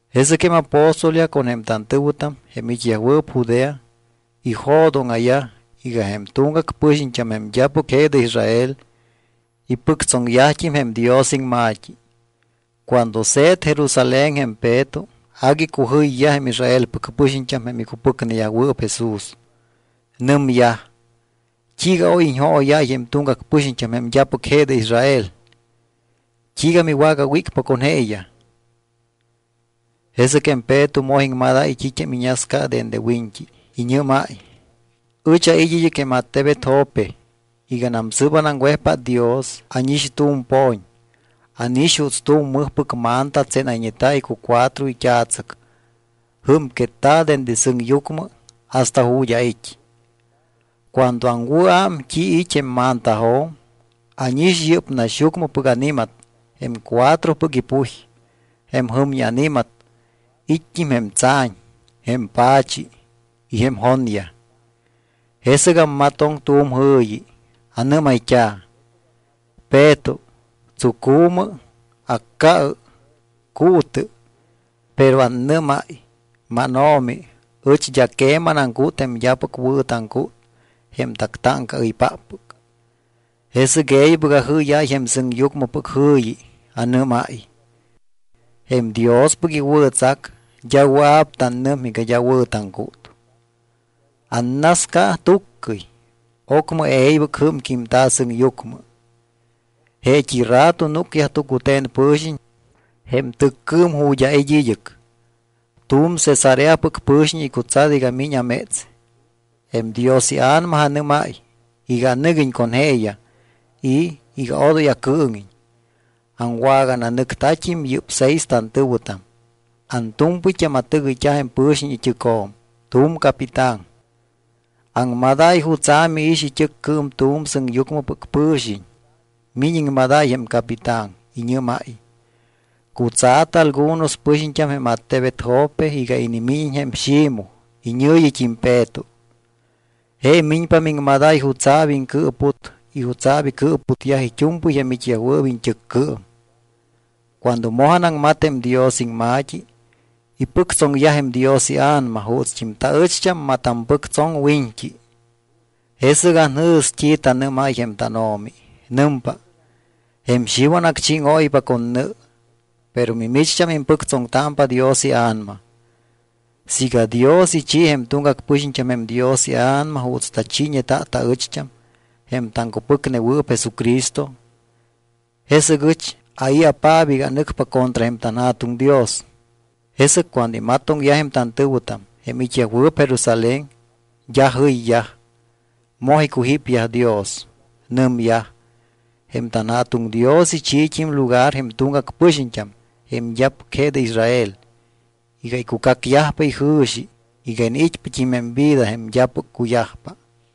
Jesɨc jém apóstolyaj con jém tantɨ̱wɨtam, jém it́yajwɨɨp Judea, ijo̱dóŋa̱yaj iga jém tuŋgac pɨxiñt́am, jém d́apɨc je de Israel, ipɨctsoŋyajt́im jém Dios iŋma̱t́i. Cuando se̱t Jerusalén jém Peto, agui icujɨyyaj jém Israelpɨc pɨxiñt́am jém icupɨcneyajwɨɨp Jesús. Nɨmyaj: —¿T́iiga oy iñjooyáy jém tuŋgac pɨxiñt́am jém d́apɨc je de Israel? ¿T́iiga miwagawícpa con jeeyaj? Jesɨc jém Peto moj iŋmadáy t́it́am iñasca dende wiñt́i. Iñɨ́máy: —Ɨch ait́ id́ɨc jém attebet Jope. Iganam sɨ́p anaŋwejpát Dios, ánix tu̱m po̱ñ. Ánix juuts tu̱m mɨjpɨc manta tsénayñeta̱ icucuatro it́a̱tsɨc, jɨ́mquetta̱ dende sɨŋyucmɨ hasta ju̱t́ ait́. Cuando aŋwɨ̱ám t́i it́ jém mantajo̱m, ánix yɨ́p naxyucmɨpɨc ani̱mat jém cuatropɨc ipuj, jém jɨmñi ani̱mat, it́t́im jém tsa̱ñ, jém pa̱chi y jém jonyaj. Jesɨc ammatoŋ tu̱m jɨ̱yi. Anɨ́mayt́a̱: “Peto, tsucu̱mɨ, acca̱ɨ, cuutɨ.” Pero annɨ́máy: “MánO̱mi, ɨch d́a queman aŋcút jém d́apɨc wɨ̱ taŋcút jém tactáŋcaɨypáppɨc.” Jesɨc e̱ybɨc ajɨ́yáy jém sɨŋyucmɨpɨc jɨ̱yi. Anɨ́máy: “Jém Diospɨc iwɨ̱tsac, d́a wɨa̱p tannɨm iga d́a wɨ̱ taŋcút.” Annasca tuccɨy. Ocmɨ e̱ybɨc jɨ́mquímta̱ sɨŋyucmɨ. Jeet́i rato núcyaj tucute̱n pɨ̱xiñ jém tɨccɨɨm ju̱t́ ait́ id́ɨc. Tu̱m Cesareapɨc pɨ̱xiñ icutsat iga miñ améts. Jém Dios iA̱nama anɨ́máy iga anɨguiñ con jeeyaj y iga odoy acɨɨŋiñ. Aŋwagananɨctat́im yɨ́p seis tantɨ̱wɨtam. Antu̱mpɨyt́am atɨgɨyt́a jém pɨ̱xiñ it́ɨcjo̱m, tu̱m capitán. Aŋmadáy jutsa̱ miix it́ɨccɨɨm tu̱m sɨŋyucmɨpɨc pɨ̱xiñ. Miñ iŋmadáy jém capitán. Iñɨ́máy: “Cutsa̱tɨ algunos pɨxiñt́am jém attebet Jope iga inimíñiñ jém Ximoj iñɨ̱yit́im Peto. Je miñpa miŋmadáy jutsa̱p iŋcɨɨput y jutsa̱p icɨɨputyaj it́u̱mpɨy jém it́yajwɨɨp iñt́ɨccɨɨm.” Cuando moj anaŋmat jém Dios iŋma̱t́i, ipɨctsoŋyaj jém Dios iA̱nama juutst́im taɨcht́am matampɨctsoŋ wiñt́i. Jesɨc anjɨ̱s t́i tanɨ́máy jém tánO̱mi. Nɨmpa: “Jém Xiwan acchíŋóypa con nɨ, pero mimicht́am impɨctsoŋtámpa Dios iA̱nama.” Siiga Dios ichi jém tuŋgac pɨxiñt́am jém Dios iA̱nama juuts tachiiñeta taɨcht́am, jém taŋcupɨcnewɨɨp Jesucristo, ¿jesɨc ɨch ai̱apaap iga anɨcpa contra jém tanJa̱tuŋ Dios? Jesɨc cuando imatoŋyaj jém tantɨ̱wɨtam, jém it́yajwɨɨp Jerusalén, d́a jɨyyaj. Moj icujípyaj Dios. Nɨmyaj: —Jém tanJa̱tuŋ Dios ichiit́im lugar jém tuŋgac pɨxiñt́am jém d́apɨc je de Israel iga icucacyajpa ijɨ̱xi iga iniit́pat́im jém vida jém d́apɨc cuyajpa.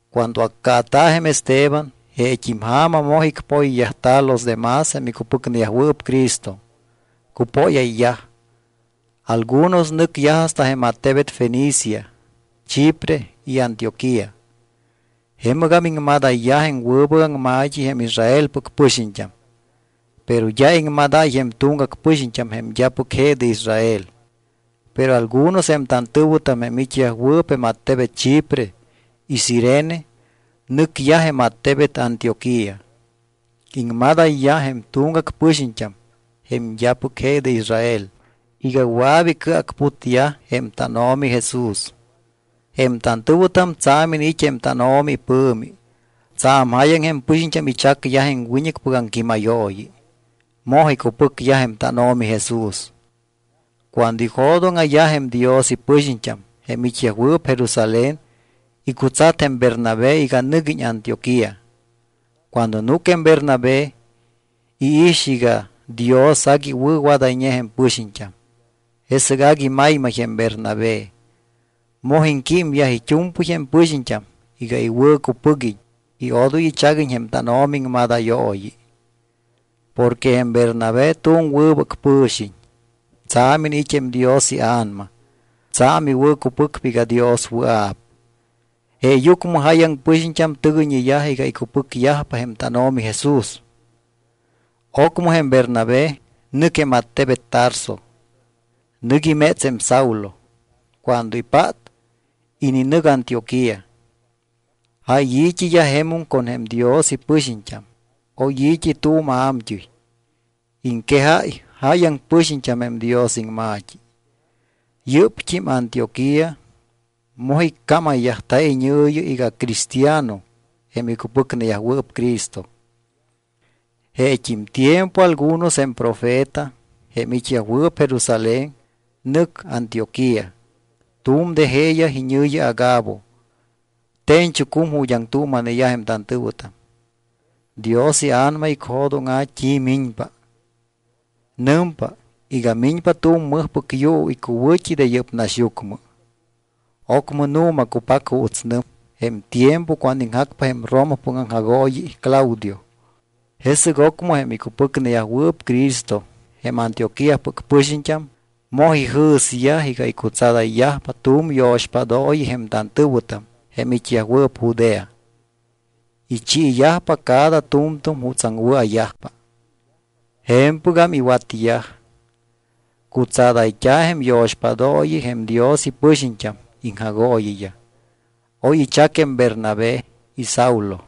Cuando accaata̱ jém Esteban, jeet́im ja̱ma moj icpoyyajta̱ los demás jém icupɨcneyajwɨɨp Cristo. Cupóyayyaj. Algunos nɨcyaj hasta jém attebet Fenicia, Chipre y Antioquía. Jemɨgam iŋmadayyaj jém wɨbɨc aŋma̱t́i jém Israelpɨc pɨxiñt́am. Pero d́a iŋmadáy jém tuŋgac pɨxiñt́am jém d́apɨc je de Israel. Pero algunos jém tantɨ̱wɨtam jém it́yajwɨɨp jém attebet Chipre y Cirene nɨcyaj jém attebet Antioquía. Iŋmadayyaj jém tuŋgac pɨxiñt́am jém d́apɨc je de Israel iga wɨa̱p icɨacputyaj jém tánO̱mi Jesús. Jém tantɨ̱wɨtam tsa̱m iniit́ jém tánO̱mi ipɨ̱mi. Tsa̱m jáyaŋ jém pɨxiñt́am ichacyaj jém wiñɨcpɨc aŋquímayooyi. Moj icupɨcyaj jém tánO̱mi Jesús. Cuando ijo̱dóŋa̱yaj jém Dios ipɨxiñt́am, jém it́yajwɨɨp Jerusalén, icutsat jém Bernabé iga nɨguiñ Antioquía. Cuando núc jém Bernabé, iix iga Dios agui iwɨ̱wadayñe jém pɨxiñt́am. Jesɨc agui maymay jém Bernabé. Moj iŋquímyaj it́u̱mpɨy jém pɨxiñt́am iga iwɨ̱cupɨguiñ y odoy ichaguiñ jém tánO̱mi iŋmadayooyi. Porque jém Bernabé tu̱m wɨbɨc pɨ̱xiñ, tsa̱m iniit́ jém Dios iA̱nama. Tsa̱m iwɨ̱cupɨcpa iga Dios wɨa̱p. Jeeyucmɨ jáyaŋ pɨxiñt́am tɨgɨyñeyaj iga icupɨcyajpa jém tánO̱mi Jesús. Ocmɨ jém Bernabé nɨc jém attebet Tarso. Nɨc iméts jém Saulo. Cuando ipát, ininɨc Antioquía. Jáy i̱t́iyaj jemum con jém Dios ipɨxiñt́am. Oy i̱t́i tu̱m a̱mt́ɨy. Iŋquejáy jáyaŋ pɨxiñt́am jém Dios iŋma̱t́i. Yɨ́pt́im Antioquía moj iccámayyajta̱ iñɨ̱yi iga cristiano jém icupɨcneyajwɨɨp Cristo. Jeet́im tiempo algunos jém profeta, jém it́yajwɨɨp Jerusalén, nɨc Antioquía. Tu̱m de jeeyaj, iñɨ̱yi Agabo, te̱ñchucum ju̱t́ aŋtuuma̱neyaj jém tantɨ̱wɨtam. Dios iA̱nama icjo̱dóŋa̱ t́i miñpa. Nɨmpa iga miñpa tu̱m mɨjpɨc yuu icuwɨ̱t́i de yɨ́p naxyucmɨ. Ocmɨ nu̱ma cupac juuts nɨm, jém tiempo cuando iŋjacpa jém Romapɨc aŋjagooyi Claudio. Jesɨc ocmɨ jém icupɨcneyajwɨɨp Cristo, jém Antioquíapɨc pɨxiñt́am, moj ijɨ̱syaj iga icutsadayyajpa tu̱m yo̱xpádooyi jém tantɨ̱wɨtam jém it́yajwɨɨp Judea. Ichiiyajpa cada tu̱mtu̱m jutsaŋ wɨa̱yajpa. Je̱mpɨgam iwatyaj. Cutsadayt́a̱ jém yo̱xpádooyi jém Dios ipɨxiñt́am iŋjagooyiyaj. Oy ichac jém Bernabé y Saulo.